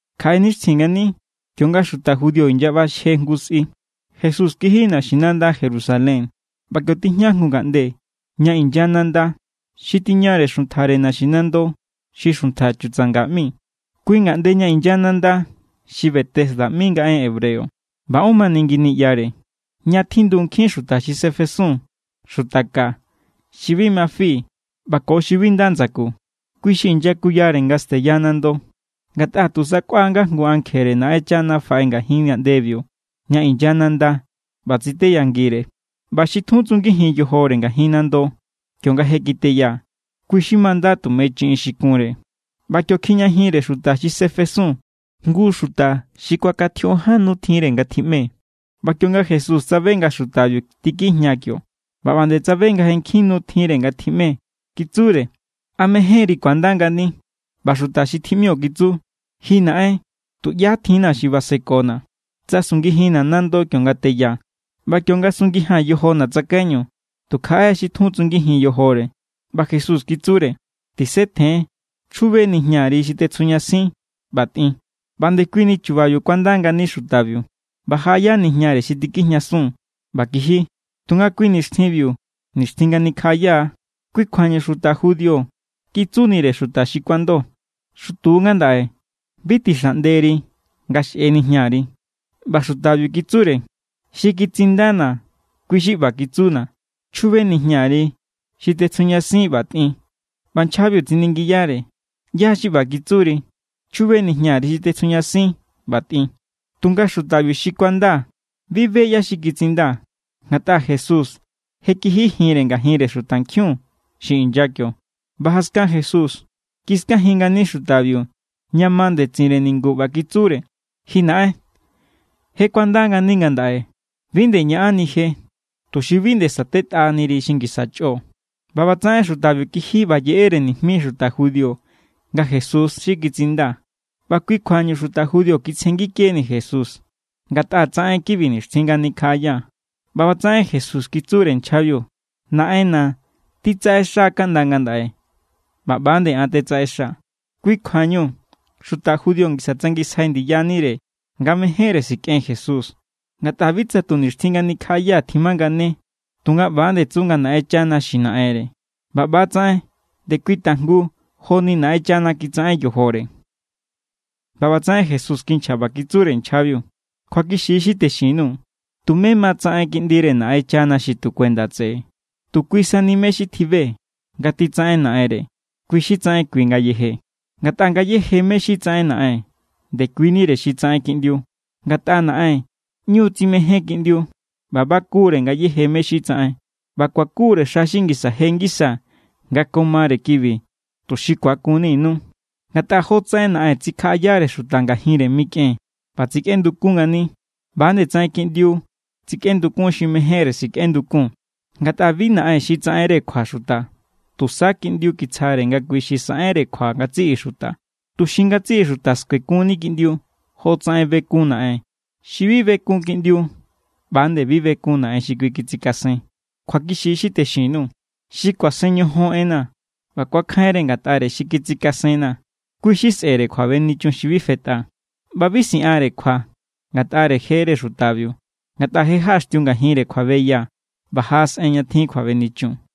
Kjaꞌe nixtjin ngani kionga xuta judío inyaꞌbaxje jngu sꞌi, Jesús kiji naxinanda Jerusalén. ꞌBa kio tijña jngu ngaꞌnde ña inya nanda xi tiñare xuntjare naxinando xi Xuntja Chutsanga ꞌmi. Kui ngaꞌnde ña inya nanda xi Betesda ꞌmi nga en hebreo. ꞌBa ón mani ngi niꞌyare, ña tjindu nkjin xuta xi sefesun: xuta ka, xi bi ma fi, ꞌba ko xi bi nda ndsaku. Kui xi inyakuyare nga steya nando. Ngatꞌa tu sakꞌua nga jngu ankjere Naꞌenchana faꞌe ngajin ngaꞌndebiu ña inya nanda ꞌba tsiteyangire, ꞌba xi tjun tsungijin yojore ngajin nando kionga je kiteya, kui= xi manda tume chiꞌin xi kunre. ꞌBa kio kjijñajinre xuta xi sefesun jngu xuta xi kuakantjioꞌon ján nu tjinre nga tjiꞌme. ꞌBa kionga Jesús tsabe nga xutabiu tikjijña kio ꞌba ꞌba nde tsabe nga je nkjin nu tjinre nga tjiꞌme, kitsure: —¿A mejénri ku̱anda ngani? ꞌBa xuta xi tjiꞌmio kitsu: —Ji naꞌen, tuꞌyá tjinna̱ xi kuasekona̱, tsa sungijinna̱ nando kionga teya. ꞌBa kionga sungijia̱n yojona̱ tsakaiñu, tu kjaꞌe xi tjun tsungijin yojore. ꞌBa Jesús kitsure: —Tisetjen, chjube nijñari xi tetsjujñasin ꞌba tꞌin. ꞌBa ndekuini chubabiu kuanda ngani xutabiu, ꞌba jaꞌaya nijñare xi tikjijñasun ꞌba kiji. Tunga kui nixtjinbiu, nixtjin nga nikjaꞌaya=. Kui kjuañu xuta judío kitsunire xuta xi kuando: —Xutu= ngandaꞌe. Bi tixaꞌnderi nga xꞌe nijñari. ꞌBa xutabiu kitsure: —Xi kitsindana̱, kui xi ꞌba kitsuna̱: “Chjube nijñari xi tetsjujñasin ꞌba tꞌin.” ꞌBa nchjabiu tsiningiyare: —¿ꞌYá= xi ꞌba kitsuri: “Chjube nijñari xi tetsjujñasin ꞌba tꞌin”? Tunga xuta xi kuanda bi be ꞌyá= xi kitsinda, ngatꞌa Jesús je kijijinre ngajinre xutankjiun xi inya kio. ꞌBa jaskan Jesús kiskajin ngani xutabiu ña ma ndetsinre ningu ꞌba kitsure: —Ji naꞌen, je kuanda ngani ngandaꞌe. Bi nde ñaꞌanni je, tuxi bi nde satetꞌaniri xi ngisa chꞌo. ꞌBa ꞌbatsaꞌen xutabiu kiji ꞌba yeꞌere nijmi xuta judío nga Jesús= xi kitsinda. ꞌBa kui kjuañu xuta judío kitsjengikeni Jesús, ngatꞌa tsaꞌen= kibi nixtjin nga nikjaꞌaya. ꞌBa ꞌbatsaꞌen Jesús kitsure nchjabiu: —Naꞌenna̱ titsaꞌexa kaꞌnda ngandaꞌe, ꞌba ꞌba nde an tetsaꞌexa. Kui= kjuañu xuta judío ngisa tsangisjai ndiyanire nga mejénre sikꞌen Jesús, ngatꞌa bi tsa tu nixtjin nga nikjaꞌaya tjimangane, tunga ꞌba=nde tsu nga Naꞌenchana xi naꞌenre ꞌba ꞌba=tsaꞌen ndekui tajngu joni Naꞌenchana kitsaꞌen yojore. ꞌBa ꞌbatsaꞌen Jesús kinchja ꞌba kitsure nchjabiu: —Kjuakixi= xi texin_nuu̱. Tumé ma tsaꞌen Kiꞌndire Naꞌenchana xi tu kuenda tseꞌe. Tu kui sani mé= xi tjibe nga titsaꞌen Naꞌenre, kui= xi tsaꞌen kui ngayeje. Ngatꞌa ngayéje mé= xi tsaꞌen Naꞌen, ndekuinire xi tsaꞌen Kiꞌndiu. Ngatꞌa Naꞌen ꞌñu= tsimején Kiꞌndiu ꞌba baku=re ngayéje mé= xi tsaꞌen. ꞌBa kuaku=re xa xi ngisa je ngisa nga ko mare kibi, tuxi ku̱akunninu. Ngatꞌa jotsaꞌen Naꞌen tsikjaꞌayare xuta ngajinre mikꞌen ꞌba tsikꞌendukun ngani, ꞌba=nde tsaꞌen Kiꞌndiu tsikꞌendukun xi mejénre sikꞌendukun. Ngatꞌa bi Naꞌen xi tsaꞌenre kjua xuta. Tusa Kiꞌndiu kitsjare nga kui xi saꞌenre kjua ngatsiꞌi xuta, tuxi ngatsiꞌi xuta skuekunni Kiꞌndiu jotsaꞌen bekun Naꞌen. Xi bi bekun Kiꞌndiu, ꞌba=nde bi bekun Naꞌen xi kui kitsikasen. ’Kjuakixi= xi texin_nuu̱. Xi kuasen ñojon enna̱ ꞌba ku̱akjainre ngatꞌare xi kitsikasenna̱, kui= xi sꞌe̱re kjuabenichun xi bi fetꞌa. ꞌBa bi siꞌanre kjua ngatꞌare jere xutabiu, ngatꞌa je jaꞌaxtiu ngajinre kjuabeya ꞌba jaꞌasꞌen ña tjin kjuabenichun.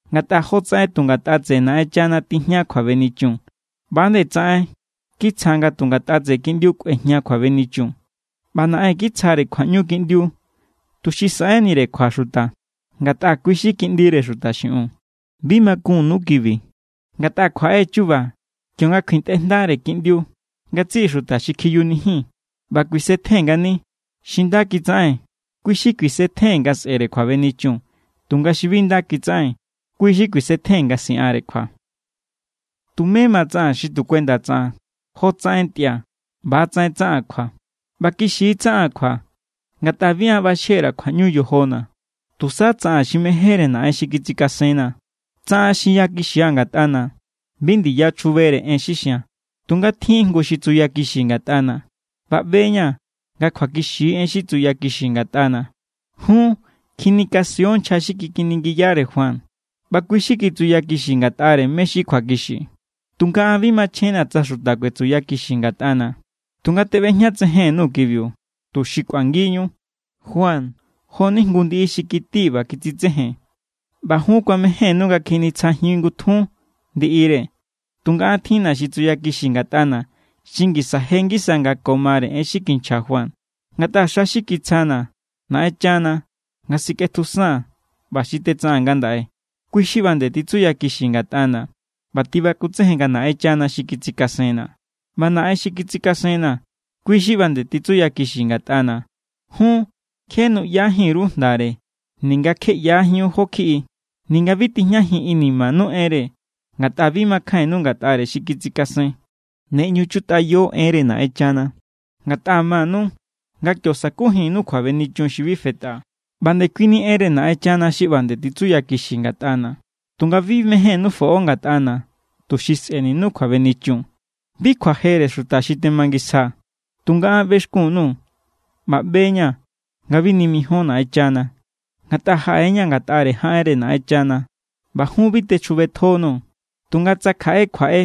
Ngatꞌa jotsaꞌen tu ngatꞌa tseꞌe Naꞌenchana tijña kjuabenichun, ꞌba=nde tsaꞌen kitsja nga tu ngatꞌa tseꞌe Kiꞌndiu kꞌuejña kjuabenichun. ꞌBa Naꞌen kitsjare kjuaꞌñu Kiꞌndiu tuxi saꞌenire kjua xuta, ngatꞌa kui= xi Kiꞌndire Xuta xiꞌiun. Bi makunnu kibi. Ngatꞌa kjuaꞌe= chu̱ba̱ kionga kjuintꞌe jndare Kiꞌndiu ngatsiꞌi xuta xi kjiyunijin ꞌba kuisetjen ngani. Xi nda kitsaꞌen, kui= xi kuisetjen nga sꞌe̱re kjuabenichun. Tunga xi bi nda kitsaꞌen, kui= xi kuisetjen nga siꞌanre kjua. ’Tumé ma tsaꞌaa̱n xi tu kuenda tsaꞌan. Jotsaꞌen ntꞌia̱, ꞌba=tsaꞌen tsaꞌaa̱n kjua. ꞌBa kixi tsaꞌaa̱n kjua, ngatꞌa bi an ꞌbaxje_ra̱ kjuaꞌñu yojona̱. Tusa tsaꞌaa̱n xi mejénre Naꞌen xi kitsikasenna̱. Tsa an xinyakixia̱ ngatꞌana̱, bi ndiya chjubere en xi xia̱n. Tunga tjin= jngu xi tsuyakixi ngatꞌana̱, ꞌba ꞌbe=ña̱ nga kjuakixi= en xi tsuyakixi ngatꞌana̱. Jun kjinikasion nchja xi kikiningiyare Juan, ꞌba kui= xi kitsuyakixi ngatꞌare mé= xi kjuakixi. Tunga an bi machjenna̱ tsa xuta kuetsuyakixi ngatꞌana̱, tunga teꞌbejñatsejen_nuu̱ kibiu, tuxi kꞌuangiñu. Juan, jo=ni jngu ndiꞌi xi kiti ꞌba kitsitsejen, ꞌba jun kuamejénnu nga kjinitsjajin ngutjun ndiꞌire. Tunga an tjinna̱ xi tsuyakixi ngatꞌana̱ xi ngisa je ngisa nga ko mare en xi kinchja Juan. Ngatꞌa xa xi kitsjana̱ Naꞌenchana nga sikꞌetjusaa̱n ꞌba xi tetsaꞌaa̱n ngandaꞌe, kui= xi ꞌba nde titsuyakixi ngatꞌana̱ ꞌba tibakutsejen nga Naꞌenchana xi kitsikasenna̱. ꞌBa Naꞌen xi kitsikasenna̱, kui= xi ꞌba nde titsuyakixi ngatꞌana̱. Jun kje nuꞌyajin_ru jndare ninga kje ꞌyajíun jó kjiꞌi. Ninga bi tijñajin inimanu enre, ngatꞌa bi makjainnu ngatꞌare xi kitsikasen. Ne ꞌñu chutꞌayo enre Naꞌenchana, ngatꞌa manu nga kio sa̱kujinnu kjuabenichun xi bi fetꞌa. ꞌBa ndekuini enre Naꞌenchana xi ꞌba nde titsuyakixi ngatꞌana̱, tunga bi mejénnú foꞌo ngatꞌana̱, tuxi sꞌe̱ninu kjuabenichun. ’Bi kjuajere xuta xi temangisjaa̱. Tunga an ꞌbexkun_nuu̱ ꞌba ꞌbeña̱ nga bi nimijion Naꞌenchana. Ngatꞌa jaꞌe=ña̱ ngatꞌare jaꞌenre Naꞌenchana̱, ꞌba jun bi techjubetjonuu̱. Tunga tsa kjaꞌe kjuaꞌe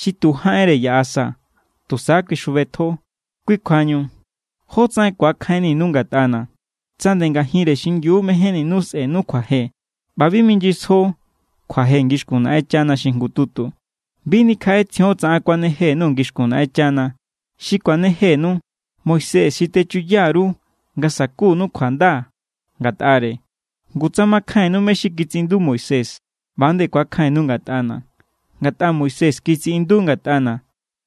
xi tu jaꞌenre yaꞌa sa, tusa kui xjubetjo. Kui kjuañu, ¿jó tsaꞌen ku̱akjainninu ngatꞌana̱? Tsa nde ngajinre xingiu mejénninu sꞌe̱nu kjuaje ꞌba bi minyisjo kjuaje ngixkun Naꞌenchana xi jngututu. Bi nikjaꞌetsjion tsa an kuaneje_nuu̱ ngixkun Naꞌenchana. Xi kuanejenu, Moisés= xi techuya_ru nga sakunu kjuanda ngatꞌare. Ngu tsa makjainnu mé= xi kitsiꞌindu Moisés, ꞌba=nde ku̱akjainnu ngatꞌana̱, ngatꞌa Moisés kitsiꞌindu= ngatꞌana̱.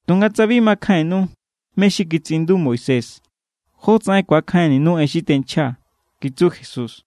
Tunga tsa bi makjainnu mé= xi kitsiꞌindu Moisés, ¿jótsaꞌen ku̱akjainninu en xi tenchjaa̱? —kitsu Jesús.